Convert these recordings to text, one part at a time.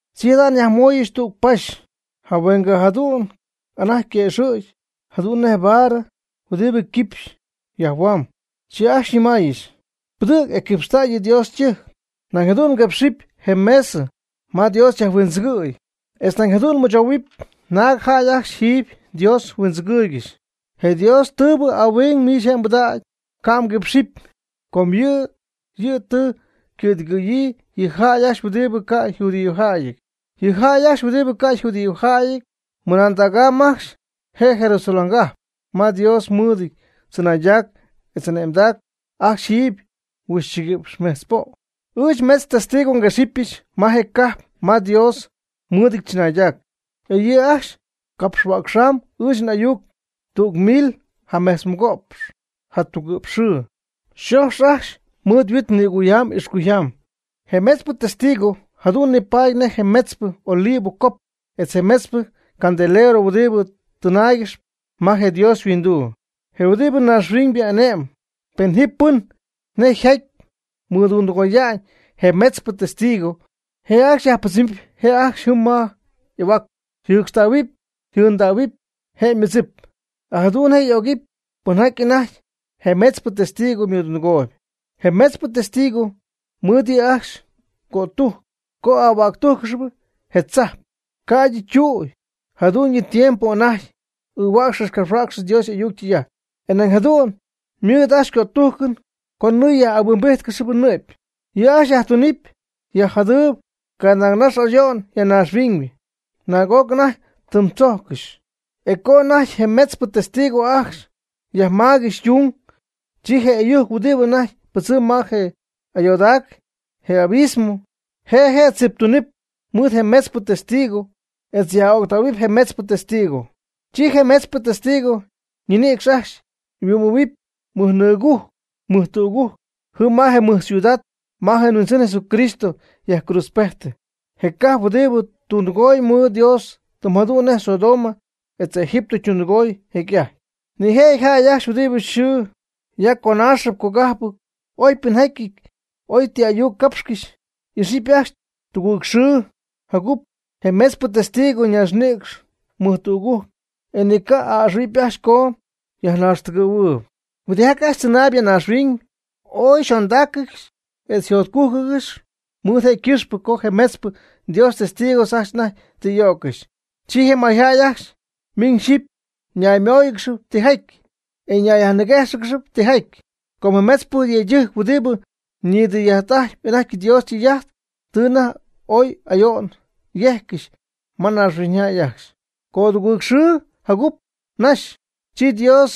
Chi jada' nyajmooyɨch tüg paxy, jahuengɨ jadu'n anajty yquëxɨ̈gy jadu'n nej baarɨ huɨdibɨ quipx yajhuamb. Chi ajcxy xyñɨmaayɨch: ―Pɨdɨ̈g e quipxta' yɨ Dios ytɨjc, nañ jadu'n quipx je mesɨ ma Dios yajhuindzɨgɨ̈y, etz nañ jadu'n mɨchou naag jäy ajcxy jiiby Dios huindzɨgɨɨygɨxy. Je Dios ytɨba' ahuing miich je' pɨdäg, ca' mguipxɨpy. Com yɨ' yɨ' tɨ ycɨ̈dɨgɨ̈yii yɨ jäy ajcxy huɨdibɨ ca' yjudíojäyɨty. Yɨ jäy ajcxy huɨdibɨ ca' yjudíojäyɨty ymɨmadägamyb ajcxy je Jerusaléngajp ma Dios mɨɨdɨty tzɨnaydac etz ane'mamb ajcxy jiiby huixchiguïpx metz po'. Ɨɨch metz testigo nguexɨpyɨch ma je cajp ma Dios mɨɨdɨty tzɨnaydac, e yɨ' ajcxy capxhuäcxamb ɨɨch n'ayuc tüg mil jametzmɨgo'px jatugɨ'px xɨɨ. Yxoxyɨty ajcxy mɨɨd huit nïcuyjaam ixcuyjaam. Je metzpɨ testigo jadu'n nipaady nej je metzpɨ olivo cop etz je metzpɨ candelero huɨdibɨ tɨnaaygɨxp ma je Dios yhuinduu, je huɨdibɨ ñaaxhuiñybɨ ane'mb. Pen ji pɨn nej jaty mɨdundɨgoya'ñ je metzpɨ testigo, je' ajcxy yajpɨdzɨmɨp je' ajcxy jɨɨn ma y'ahuac, yjɨcxtähuɨpy yjɨɨndähuɨpy je' ymɨdzip. E jadu'n je' y'ögɨpy pɨnjaty anajty je metzpɨ testigo mɨdundɨgooyb. Je metzpɨ testigo ymɨɨd yɨ' ajcxy cötujc co ahuäctújccɨxɨty je tzajp, ca'ydɨ ytüy jadu'ñyɨ tiempo anajty ɨɨhuäcxcɨxy capxhuäcxcɨxy Dios y'ayuc ytɨy'ajt. E nañ jadu'n ymɨɨd ajcxy cötujcɨn co nɨɨ yaj'ahuimbíjtcɨxɨpy nɨ'py. Yɨ' ajcxy yajtunɨɨb yaj'jadɨɨb canaagnax ayo'n ya naaxhuiñ, naag'oc anajty ytɨmdzójccɨxy. E co anajty je metzpɨ testigo ajcxy yajmaaygɨxy ytung, chi je ɨyujc huɨdibɨ anajty pɨdzɨmb ma je ayoodac, je abismo, je' je' tziptuunɨp mɨɨd je metzpɨ testigos etz yaj'öctähuɨp je metzpɨ testigo. Chi je metzpɨ testigo ñinïcx ajcxy yhuɨ'mɨpy mɨjnɨɨgujc mɨjtügujc jɨm ma je mɨj ciudad ma je Huindzɨn Jesucristo yajcruudzpejtɨ, je cajp huɨdibɨ tundɨgooy mɨɨd Dios tɨm jadu'n nej Sodoma etz Egipto ytundɨgooy jecy'ajty. Nijëjɨty jäy ajcxy huɨdibɨ xɨ ya conaaxɨp cogajpɨp, oy ypɨnjäyɨty, oy ti ayuc capxcɨxy, y'ixɨpy ajcxy tugɨɨg xɨɨjagup je metzpɨ testigo ñaaxnïcx mɨjtügujc, e ni ca'a'ɨxɨ̈huɨpy ajcxy co yajnaaxtɨgɨ̈huɨɨyb. Huɨdijaty ajcxy tzɨnaayb ya naaxhuiñ ooy yxondáaccɨxɨpy etz yjotcugɨ́ɨygɨxɨpy mɨɨd je' ycɨxpɨ co je metzpɨ Dios ytestigos ajcxy anajty tɨ y'o'ccɨxy. Chi je mayjäy ajcxy miñ xyɨpy ñaymóoyɨgɨxɨpy tijaty, e ñayyajniguéjxɨgɨxɨpy tijaty. Com je metzpɨ yëydɨjc huɨdibɨ nidɨy'ajt'ajtp anajty Dios ytɨy'ajt, tɨ anajty ooy ayo'n yejccɨxy ma naaxhuiñyjäy ajcxy. Codugɨɨgxɨɨ jacup naxy, chi Dios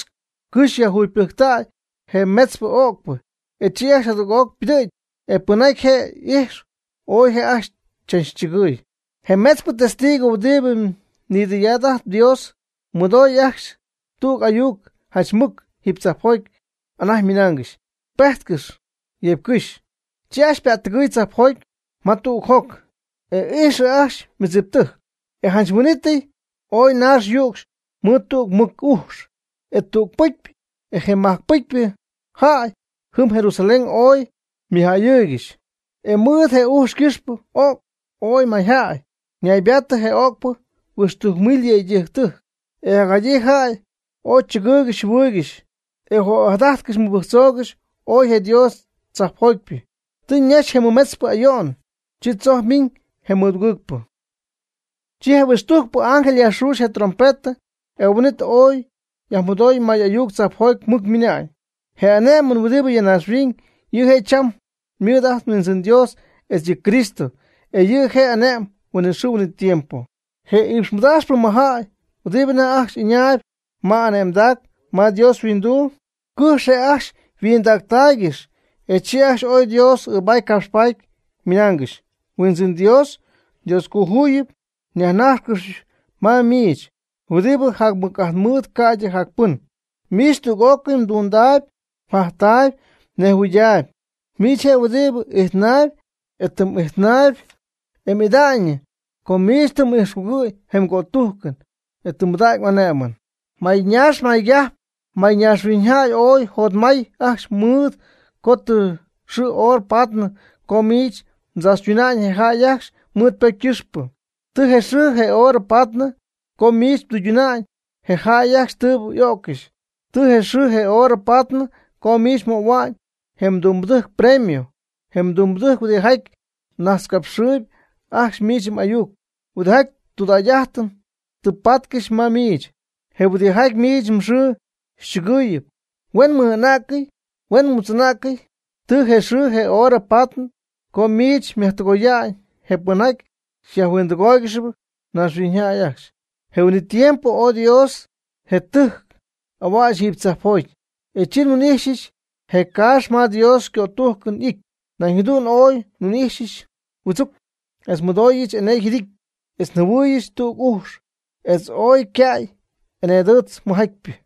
cɨjx yajjugypɨjctäy je metzpɨ öcpɨ, e chi ajcxy jadüg'oc ypɨdɨ̈gy, e pɨnjaty je' ijx, ooy je' ajcxy chachchɨgɨɨy. Je metzpɨ testigo huɨdibɨ nidɨy'ajt Dios, mɨdoy ajcxy tüg ayuc janch mɨc jiiby tzajpjoty anajty ñɨmáayɨgɨxy: ―Pejtcɨx yeeby cɨx. Chi ajcxy ypa'ttɨgɨɨy tzajpjoty ma tüg joc, e ijxɨ ajcxy ymɨdziptɨjc. E janch huin'ítɨy ooy naax yücxy mɨɨd tüg mɨc ujx. E tüg pɨcypɨ je majc pɨcypɨ jäy jɨm Jerusalén oy ymɨjähuɨɨygɨxy. E mɨɨd je ujx ycɨxpɨ y'o'cy ooy mayjäy, ñaybaatɨ je öcpɨ huixtujc mil yëydɨjc. E jacjadyii jäy ooy chɨgɨɨygɨxy yjɨhuɨɨygɨxy, e ojadajtcɨxy mɨbɨjctzoogɨxy ooy je Dios tzajpjotypɨ. Tɨ ñaxy je mɨmetzpɨ ayo'n, chi tzojc ymiiñ je mɨdugɨɨgpɨ. Chi je mɨhuixtujcpɨ ángel yajxuxy je' ytrompetɨ, e huin'it oy yajmɨdooy may'ayuc tzajpjoty mɨc ymɨnañ: Je ane'mɨn huɨdibɨ ya naaxhuiñ, yɨ' je' cham mɨɨd ajt nHuindzɨn Dios etz yɨ' yCristo, e yɨ' je' ane'mɨp huinɨxɨɨ huinɨtiempo. Je iipxmɨdaaxpɨ mɨjjäy huɨdibɨ anajty ajcxy ɨñaayb ma y'ane'mdac ma Dios yhuinduu, cɨjx je' ajcxy yhuɨjoj'ɨhuɨydaaygɨxy, e chi ajcxy ooy Dios ɨɨbaty capxpaty, ymɨnaangɨxy: Huindzɨn Dios, Dioscojuyip nyajnájxcɨxpɨch ma miich, huɨdibɨ jac mɨc'ajt mɨɨd ca'ydɨ jac pɨn. Miich tüg'ócɨy mdundaayb mjajtaayb mnejhuɨɨydaayb. Miich je' huɨdibɨ ijtnaayb, e tɨ m'ijtnäy, e m'ida'ñyɨ, com miich tɨ m'ijxcugɨ̈y je mgötujcɨn, e tɨ mbɨdägy m'ane'mɨn. Mayñaax maygajp mayñaaxhuiñyjäy ooy yjotmäty ajcxy, mɨɨd co tɨ xɨɨ horɨ paady co miich mdzaachytuna'ñ je jäy ajcxy mɨɨd ypocy ycɨxpɨ. Tɨ je xɨɨ je hora paady co miich mdɨyduna'n je jäy ajcxy tɨɨbɨ y'o'ccɨxy. Tɨ je xɨɨ je horɨ paady co miich mmöhua'ñ je mdumbɨdɨjc ypremio, je mdumbɨdɨjc huɨdijaty najtzcapxɨɨy ajcxy miich m'ayuc, huɨdijaty tudägy'ajtɨn tɨ patcɨxp ma miich, je huɨdijaty miich mxɨɨ xychɨgɨɨyɨp, huen ymɨj'ana'cɨty huen ymutz'ana'cɨty. Tɨ je xɨɨ je hora paady co miich myajtɨgoya'ñ je pɨnjaty yajhuindɨgooygɨxyp naaxhuiñyjäy ajcxy. Je huin'it tiempo oy Dios je ytɨjc y'ahuäch jiiby tzajpjoty, e chi nhuin'ijxyɨch je caax ma Dios ycötujcɨn y'ity. Nañ jadu'n oy nhuin'ijxyɨch huɨdzuc, etz nmɨdooyɨch co ooy ñe'my, etz nmɨdooyɨch enee yjɨdijtɨn, etz njɨhuɨɨyɨch tüg ujx, etz ooy yca'y eneedɨɨtz mɨjatypɨ.